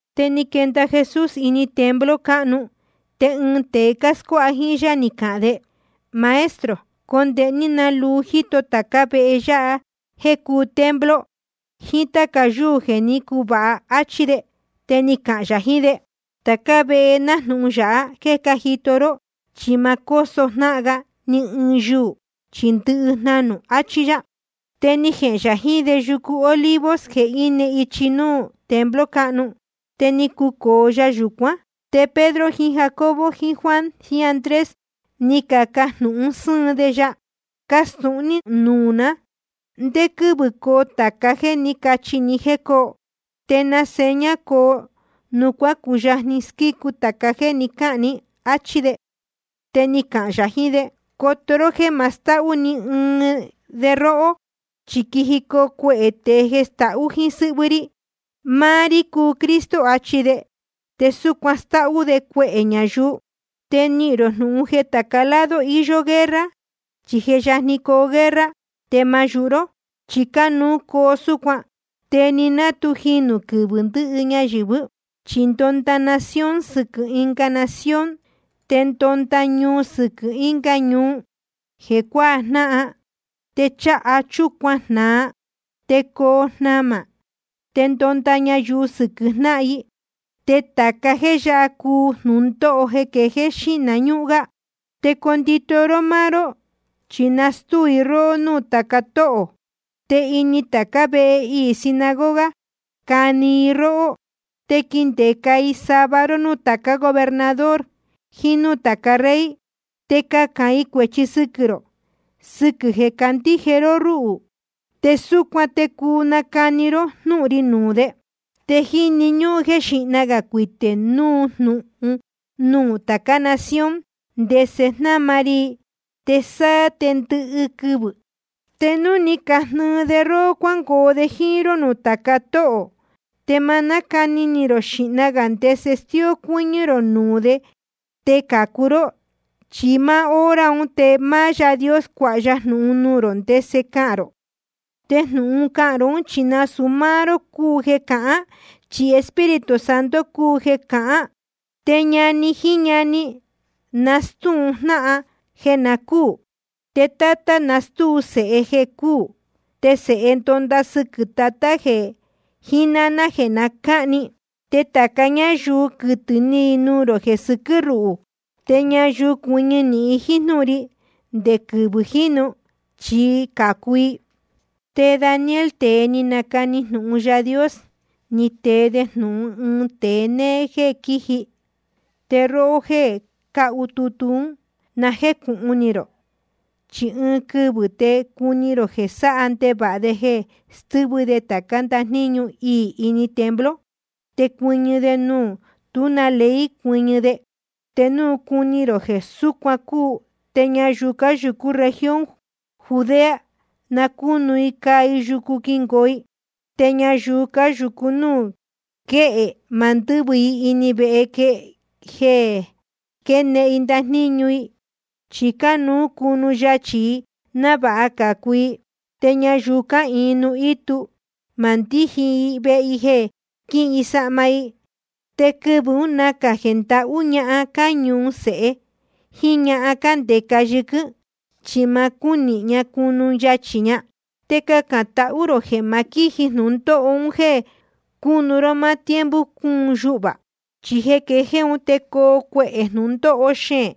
Te ni quenda Jesús ini templo cáhnu, te ɨɨn tēe scuáha jíín yá ni cahān de: Maestro, condēhe ní ná luu jíto tācá vehe yáha jéē cúu templo, jiín táca yúū jeē ní cuvāha, áchí de. Te ni cahān yā jiín de: Tācá vehe náhnu yāha jéē cájito ró, chi ma cóso jnáhan ga ni ɨɨn yuū, chi ndɨhɨ jnanū. Achí yá. Te ni jehēn yā jiín de yucu Olivos jeē íne ichi núú templo cáhnu. Te ni cucōo ya yūcuán. Te Pedro jiín Jacobo jiín Juan jiín Andrés ni cacajnūhun sɨ́ɨn de ya: Castūhun ní nuū ná, ¿ndé quɨ́vɨ̄ coo tāca jéē ní cachi ní jéē coo? ¿Te na seña coo núu cuacuyajni squícu tāca jéē ni cáhān ní? áchí de. Te ni cahān yā jiín de: Coto ró jéē ma stahú ni ɨɨn de róhó. Chi quijicoo cuehē tēe jeē stahú jíín sɨ́hvɨ́ rí. Máá rí cúu Cristo, achi de. Te súcuan stáhú de cuehē ñayuu. ’Te nihīn rō jnūhun jeē tāca lado iyó guerra, chí je yajni coo guerra. Te ma yūhu ró, chi cánuú coo súcuan. Te ni ná tu jinū quɨvɨ̄ ndɨhɨ ñayɨ̄vɨ́. Chi ndonda nación sɨquɨ̄ ɨnga nación, te ndonda ñuu sɨquɨ̄ ɨnga ñuu jeē cuajnáhan. Te cháha chúcuan jnāa, te coo jnamā, te ndonda ñayuu sɨquɨ̄ jnáhan i. Te tāca jéē yáha cácuu jnūndóho quejéé xíhna ñúhún gá. ’Te condito ró máá ró, chi nastúu i róhó núū tāca tóhō, te ini tācá vehe iī sinagoga cani i róhó. Te quindeca i sava ró núū tācá gobernador jiín núū tāca rey, te cahān i cuēchi sɨquɨ̄ rō sɨquɨ̄ jeē cácandíje ró rúhū. Te súcuan te cuu nacani ró jnúhun ri nuū de. Te jíni ñúhún jéē xíhna gā cuitē núu jnūhun nuū tācá nación ndese jnáma ri i, te sáá te ndɨhɨ quɨvɨ̄. Te núu ni cajnɨɨ de róhó cuángoo de jíín ró nuū tāca tóhō, te ma nácani ni rō xīhna gā ndese stíó cuɨ́ñɨ́ rō nuū de te cācu ró. Chi máá hora un te máá Yaā Dios cuāha ya jnūhun nuū rō ndese cahān rō, te jnūhun ún cahān rō. Chi nasūu máá ró cúu jeē cahān, chi Espíritu Santo cúu jeē cahān. Te ñani jiín ñani nastúu jnáhan jeē na cúū. Te tátá nastúu sēhe jeē cúū. Te sēhe ndonda sɨquɨ̄ tatá jiín náná jeē cahni. Te tāca ñáyuu quɨtɨ̄ ni i nuū rō jeē sɨquɨ́ ruhū. Te ñayuu cuɨñɨ nīhin jíín jnúhun ri nde quɨvɨ̄ jínu, chi cācu i. ’Te Daniel, tēe ni nacani jnūhun Yaā Dios, ni tee de jnūhun ɨɨn tēe néé jéē quíji. Te róhó jéē cácahu tutu ún, na jécūhun ni rō. Chi ɨɨn quɨvɨ̄ te cuni rō jeē sáha ndevāha de jeē stɨ́vɨ de tācá ndajníñu iī ini templo, te cuɨñɨ de nuū tú na ley cuɨñɨ de. Te núu cuni rō jeē súcuan cúu, te ñayuu cáyūcú región Judea, na cúnu i caa i yucu quingoo i. Te ñayuu cáyūcu núū quéhe, ma ndɨ́vɨ i ini vehe jeē quénehen i ndajníñu i, chi cánuú cunu yachī i návāha cācu i. Te ñayuu cáhīin nuū ítu, ma ndíji i vehe jeē quíhin i sahma i. Te quɨvɨ̄ ún nacā jeē ndahú ñahan cáñuhun sēhe jíín ñahan cándeca yɨquɨ́n, chi ma cúnihin ña cunu yachī ña. Te cacān tahú rō jeē ma quíji jnūndóho un jéē cunu ró máá tiempo cúun yuhvā. Chi jeē quejéé un te coo cuehē jnūndóho xeēn,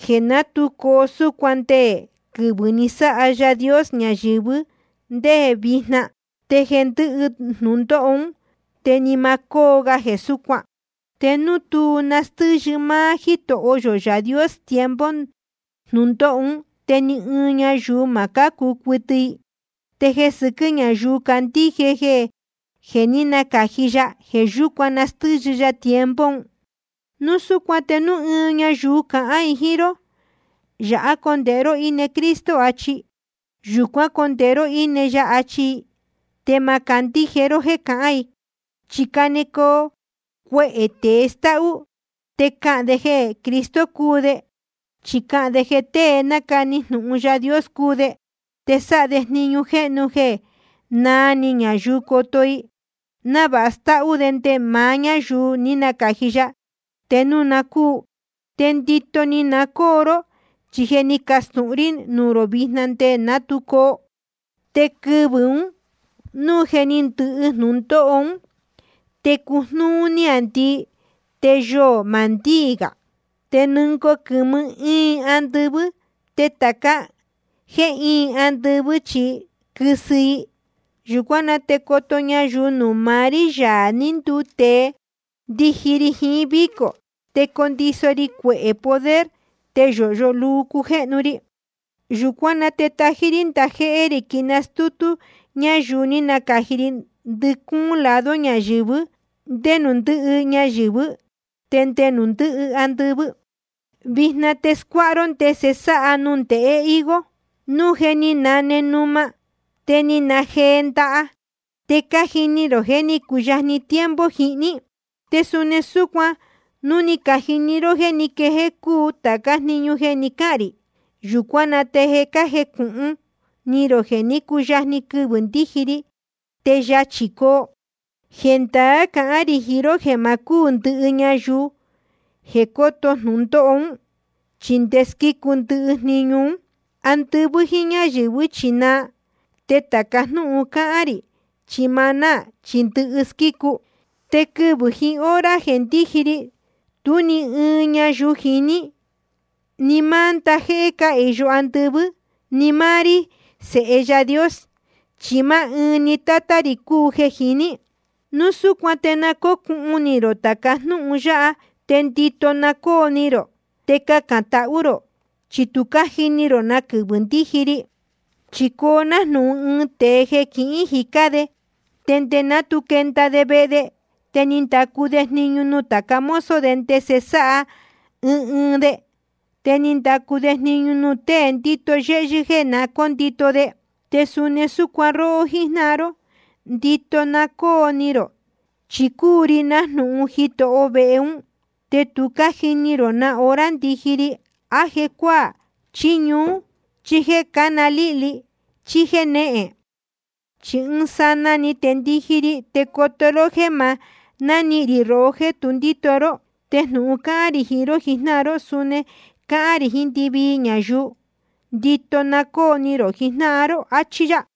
jeē ná tu coo súcuan nde quɨvɨ̄ ní sáha Yaā Dios ñayɨ̄vɨ́ te nde vijna. Te jeē ndɨ́hɨ jnūndóho ún te ni ma cóo ga jeē súcuan. Te núu tú nastɨ́yɨ máá Jítoho yō Yaā Dios tiempo jnūndóho ún, te ni ɨɨn ñayuu ma cácu cuɨtɨ i. Te jeē sɨquɨ́ ñáyuu cácandíje jeē ní nacāji ya, jeē yúcuan nastɨ́yɨ ya tiempo un. ’Núu súcuan te núu ɨɨn ñayuu cahān jiín ró: Yāhá condēhe ró íne Cristo, chí: Yūcuán condēhe ró íne ya, achi i, te ma candíje ró jéē cahán i. Chi canecoo tēe cástáhú te cahān de jeē Cristo cúu de, chí cáhān de jeē tée nácani jnūhun Yaā Dios cúu de. Te sáha de jniñu jéhnu jeē naa ni ñayuu coto i, návāha stáhú de nde maá ñáyuu ní nacāji ya, te núu na cúu. Te ndito na cóo ni rō, chi je ni castūhun rí nuū rō vijna nde ná tu coo. ’Te quɨvɨ̄ ún, núu je ni ndɨhɨ jnūndóho ún, te cujnúú níāndii, te yoō ma ndíī gā. Te nɨngoo quɨ̄mɨ íin andɨvɨ́. Te tāca jéē íin andɨvɨ́ chi quɨsɨ i. Yūcuán na te coto ñayuu nuū maá rí, Yaā ní nduu tēe, ndiji ri jiín vícō, te condiso ri cuehē poder, te yōhyo luu cujéhnu ri. Yūcuán na te tají rí ndajéhé rī quinastútú yá ñayuu ní nacāji ri ndɨcúún lado ñayɨ̄vɨ́, nde nuū ndɨ́hɨ ñayɨ̄vɨ́ te nde nuū ndɨ́hɨ andɨvɨ́. ’Vijna te scuáha ró ndese sáha nundēhe higo: Núu je ni nane numa, te ni najee ndaha, te cájini rō jeē jé ni cuyajni tiempo jihní. Te suni súcuan núu ni cajini rō jeē ní quejéé cúu tācá jniñu jeē ni cáhān rī, yūcuán na te na jécūhun ni rō jeē ní cuyajni quɨvɨ̄ ndíji ri, te yachī coo. Jendaá cahán rī jiín ró jeē ma cúū ndɨhɨ ñayuu jeē cóto jnūndóho ún, chi nde squícu ndɨhɨ jniñu ún. Andɨvɨ́ jíín ñáyɨ̄vɨ́ chi naa, te tāca jnúhun cáhán rī chi ma náā, chi ndɨhɨ squícu. ’Te quɨvɨ̄ jiín hora jeē ndíji ri, tú ni ɨɨn ñayuu jiní, ni máá ndajéhé cáhīyo andɨvɨ́, ni máá rí, Sēhe Yaā Dios. Chi máá ɨɨn ni Tátá rī cúu jeē jiní. ’Núu súcuan te na cócuhun ni rō tāca jnúhun yáha, te ndito na cóo ni rō, te cacān tahú rō, chi tu cájini rō na quɨvɨ̄ ndiji ri. Chi coo nájnūhun ɨɨn tēe jeē quihín jicá de, te nde ná tu quenda de vehe de, te ni ndacu de jniñu nuū tāca mozo de ndese sáha ɨɨn ɨɨn de. Te ni ndacu de jniñu nuū tée ndíto yéhyɨ́ jéē na cóndito de. Te suni súcuan róhó jíjnáhan ró, ndito na cóo ni rō. Chi cúu ri nájnūhun jitoho vehe ún, te tu cájini rō na hora ndiji ri, á jéē cuácuaa, chí ñuú, chí jéē cána líhli, chí jénéhen. Chi ɨɨn sanaa‑ni te ndiji ri, te coto ró jéē ma nánihīn rī rohó jéē tu ndíto ró. Te jnūhun cáhán rī jiín ró jijnáhan ró, suni cáhán rī jiín ndɨvii ñayuu: Ndito na cóo ni rō jijnáhan ró. Achí yá.